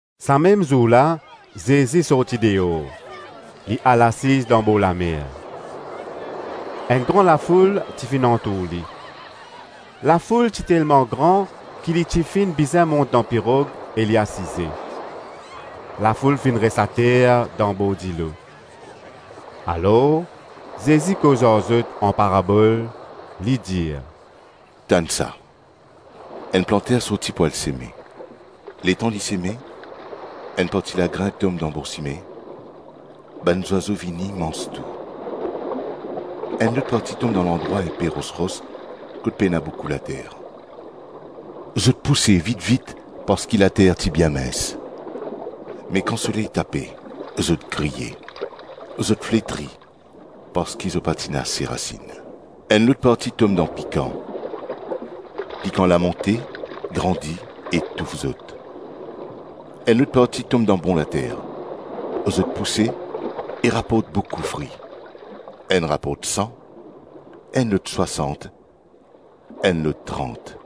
Sa mem zour la Zezi sorti deor, li al asiz dan borlamer. Enn gran lafoul ti finn antour li; lafoul ti telman gran ki li ti finn bizin mont dan pirog e li asize; lafoul finn res ater dan bor dilo. Alor Zezi koz ar zot an parabol, li dir, “Tann sa: enn planter sorti pou al seme; letan li seme, enn parti lagrin tom dan bor sime; bann zwazo vini, manz tou. Enn lot parti tom dan landrwa inpe ros-ros kot pena boukou later; zot pouse vit-vit parski later ti bien mins. Me kan soley tape, zot griye, zot fletri parski zot pa ti ena ase rasinn. Enn lot parti tom dan pikan; pikan la monte, grandi e touf zot. Enn lot parti tom dan bon later, zot pouse e raport boukou fri, enn raport san, enn lot swasant, enn lot trant.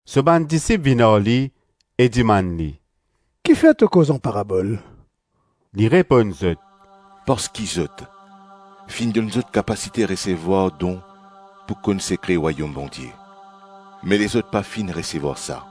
So bann disip vinn ar li e dimann li, “Kifer to koz an parabol?” Li reponn zot, “Parski zot, finn donn zot kapasite resevwar don pou konn sekre Rwayom Bondie, me lezot pa finn resevwar sa.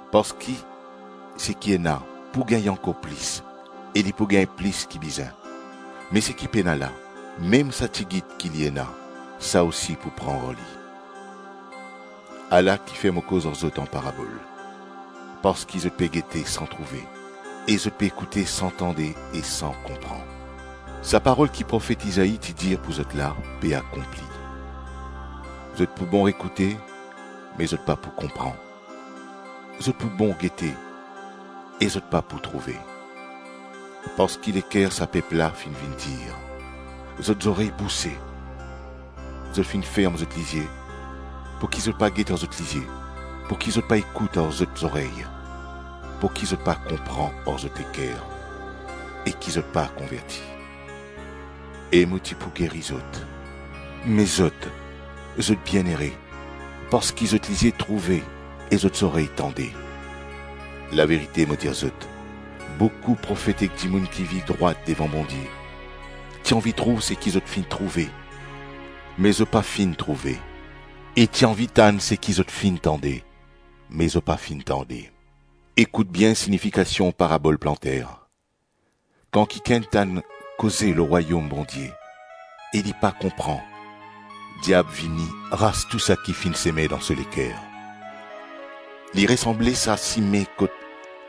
Parski seki ena, pou gagn ankor plis e li pou gagn plis ki bizin; me seki pena la, mem sa tigit ki li ena, sa osi pou pran ar li. Ala kifer mo koz ar zot an parabol, parski zot pe gete san trouve e zot pe ekoute san tande e san konpran. Sa parol ki profet Izai ti dir pou zot la, pe akonpli: ‘Zot pou bon ekoute me zot pa pou konpran zot pou bon gete e zot pa pou trouve. parski leker sa pep la finn vinn dir; zot zorey bouse, zot finn ferm zot lizie, pouki zot pa get ar zot lizie, pouki zot pa ekout ar zot zorey, pouki zot pa konpran ar zot leker, e ki zot pa konverti; e mo ti pou geri zot.’ Me zot, zot bienere, parski zot lizie trouve e zot zorey tande. Laverite, mo dir zot, boukou profet ek dimoun ki viv drwat devan Bondie ti anvi trouv seki zot finn trouve, me zot pa finn trouve; e ti anvi tann seki zot finn tande, me zot pa finn tande.” “Ekout bien sinifikasion parabol planter. Kan kikenn tann koze lor Rwayom Bondie e li pa konpran, diab vini, ras tou saki finn seme dan so leker. Li resanble sa sime kot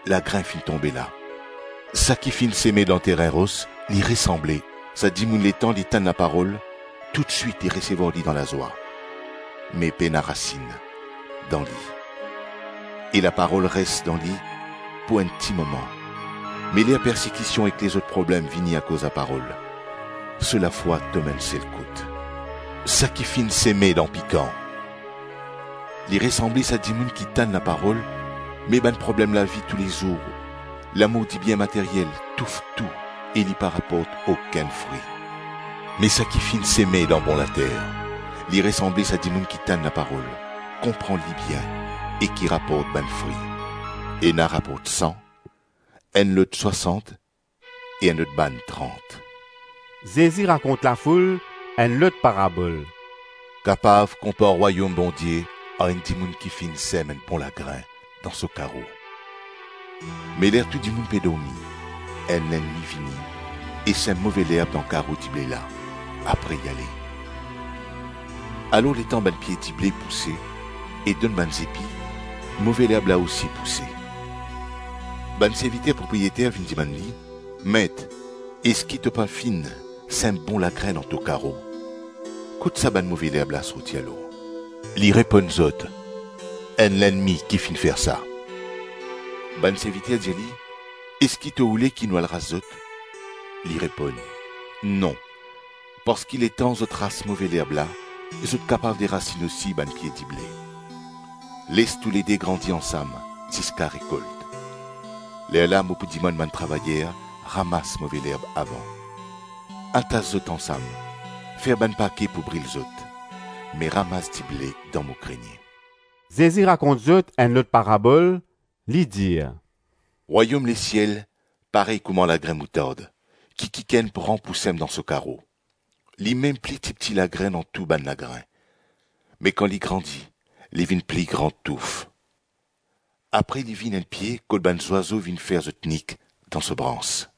lagrin finn tonbe la. Saki finn seme dan terin ros li resanble sa dimoun letan li tann laparol, toutswit li resevwar li dan lazwa. Me pena rasinn dan li e laparol res dan li pou enn ti moman; me ler persekision ek lezot problem vini akoz laparol, so lafwa tom enn sel kout. Saki finn seme dan pikan, li resanble sa dimoun ki tann laparol, me bann problem lavi tou lezour, lamour dibien materyel touf tou e li pa raport okenn fri. Me saki finn seme dan bon later, li resanble sa dimoun ki tann laparol, konpran li bien e ki raport bann fri; ena raport san, enn lot swasant e enn lot bann trant.” Zezi rakont lafoul enn lot parabol: “Kapav konpar Rwayom Bondie ar enn dimoun ki finn sem enn bon lagrin dan so karo; me ler tou dimoun pe dormi, enn lennmi vini e sem move lerb dan karo dible la, apre li ale. Alor letan bann pie dible pouse e donn bann zepi, move lerb la osi pouse. Bann serviter propriyeter vinn dimann li, ‘Met, eski to pa finn sem bon lagrin dan to karo? Kot sa bann move lerb la sorti alor?’ Li reponn zot, ‘Enn lennmi ki finn fer sa.’ Bann serviter dir li, ‘Eski to oule ki nou al ras zot?’ Li reponn, ‘Non, parski letan zot ras move lerb la, zot kapav derasinn osi bann pie dible. Les toulede grandi ansam ziska rekolt; lerla mo pou dimann bann travayer ramas move lerb avan, atas zot ansam, fer bann pake pou bril zot, me ramas dible dan mo grenie.’” Zezi rakont zot enn lot parabol, li dir, “Rwayom lesiel, parey kouma lagrin moutard ki kikenn pran pou sem dan so karo; limem pli tipti lagrin dan tou bann lagrin, me kan li grandi li vinn pli gran touf. Apre li vinn enn pie kot bann zwazo vinn fer zot nik dan so brans.”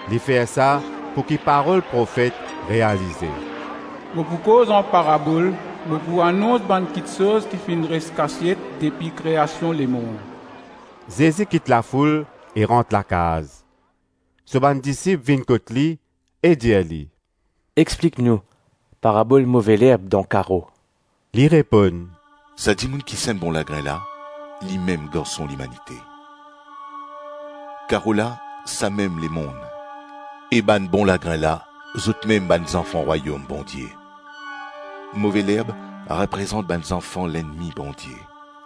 Li fer sa pouki parol profet realize: “Mo pou koz an parabol, mo pou anons bann kiksoz ki finn res kasiet depi kreasion lemonn.” Zezi kit lafoul e rant lakaz. So bann disip vinn kot li, e dir li, “Explik nou parabol move lerb dan karo.” Li reponn, “Sa dimoun ki sem bon lagrin la limem Garson Limanite. Karo la samem lemonn; e bann bon lagrin la zotmem bann zanfan Rwayom Bondie; move lerb reprezant bann zanfan lennmi Bondie,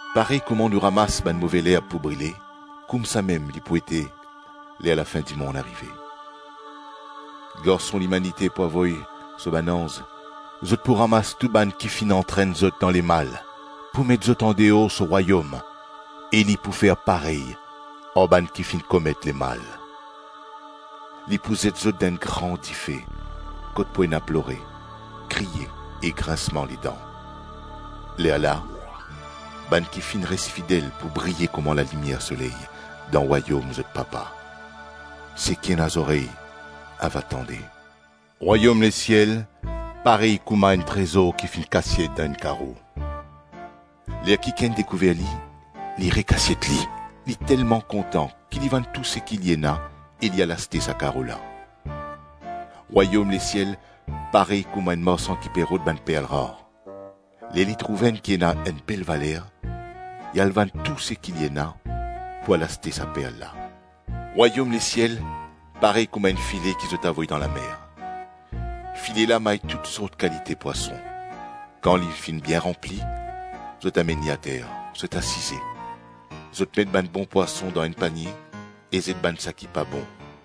Parey kouma nou ramas bann move lerb pou brile, koumsamem li pou ete ler lafin-dimonn arive. Garson Limanite pou avoy so bann anz; zot pou ramas tou bann ki finn antrenn lezot dan lemal pou met zot andeor so rwayom e li pou fer parey ar bann ki finn komet lemal. Li pou zet zot dan enn gran dife, kot pou ena plore, kriye ek grinsman ledan. Lerla, bann ki finn res fidel pou briye kouma lalimier soley dan rwayom zot Papa. Seki ena zorey ava tande.” “Rwayom lesiel, parey kouma enn trezor ki finn kasiet dan enn karo. Ler kikenn dekouver li, li rekasiet li; li telman kontan ki li vann tou seki li ena e li al aste sa karo la.” “Rwayom lesiel, parey kouma enn marsan ki pe rod bann perl rar; ler li trouv enn ki ena enn bel valer, li al vann tou seki li ena pou al aste sa perl la.” “Rwayom lesiel, parey kouma enn file ki zot avoy dan lamer. File la may tou sort kalite pwason; kan li finn bien ranpli, zot amenn li ater, zot asize, zot met bann bon pwason dan enn panie e zet bann seki pa bon.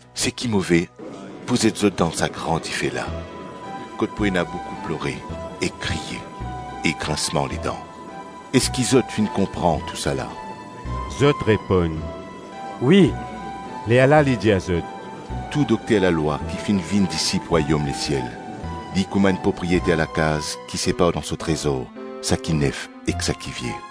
Seki move pou zet zot dan sa gran dife la, kot pou ena boukou plore ek kriye e grinsman ledan.” “Eski zot finn konpran tousala?” Zot reponn, “Wi.” Lerla li dir zot, “Tou dokter lalwa ki finn vinn disip rwayom lesiel, li kouma enn propriyeter lakaz ki separ dan so trezor saki nef ek saki vie.”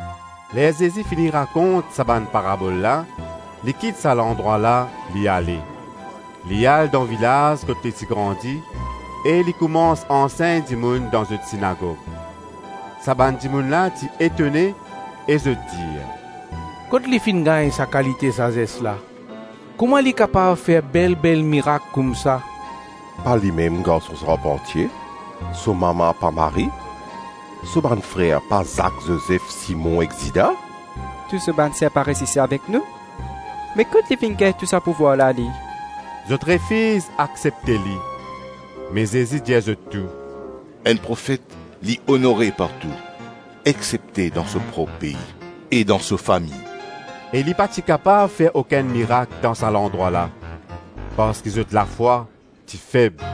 Ler Zezi fini rakont sa bann parabol la, li kit sa landrwa la, li ale. Li al dan vilaz kot li ti grandi e li koumans ansegn dimoun dan zot sinagog. Sa bann dimoun la ti etone e zot dir, “Kot li finn gagn sa kalite sazes la? Kouma li kapav fer bel-bel mirak koumsa? Pa limem garson sarpantie? So mama, pa Marie? So bann frer pa Zak, Zozef, Simon ek Zida? Tou so bann ser pa res isi avek nou? Be kot li finn gagn tou sa pouvwar la, li?” Zot refiz aksepte li. Me Zezi dir zot tou, “Enn profet, li onore partou, exsepte dan so prop pei e dan so fami.” E li pa ti kapav fer okenn mirak dan sa landrwa la, parski zot lafwa ti feb.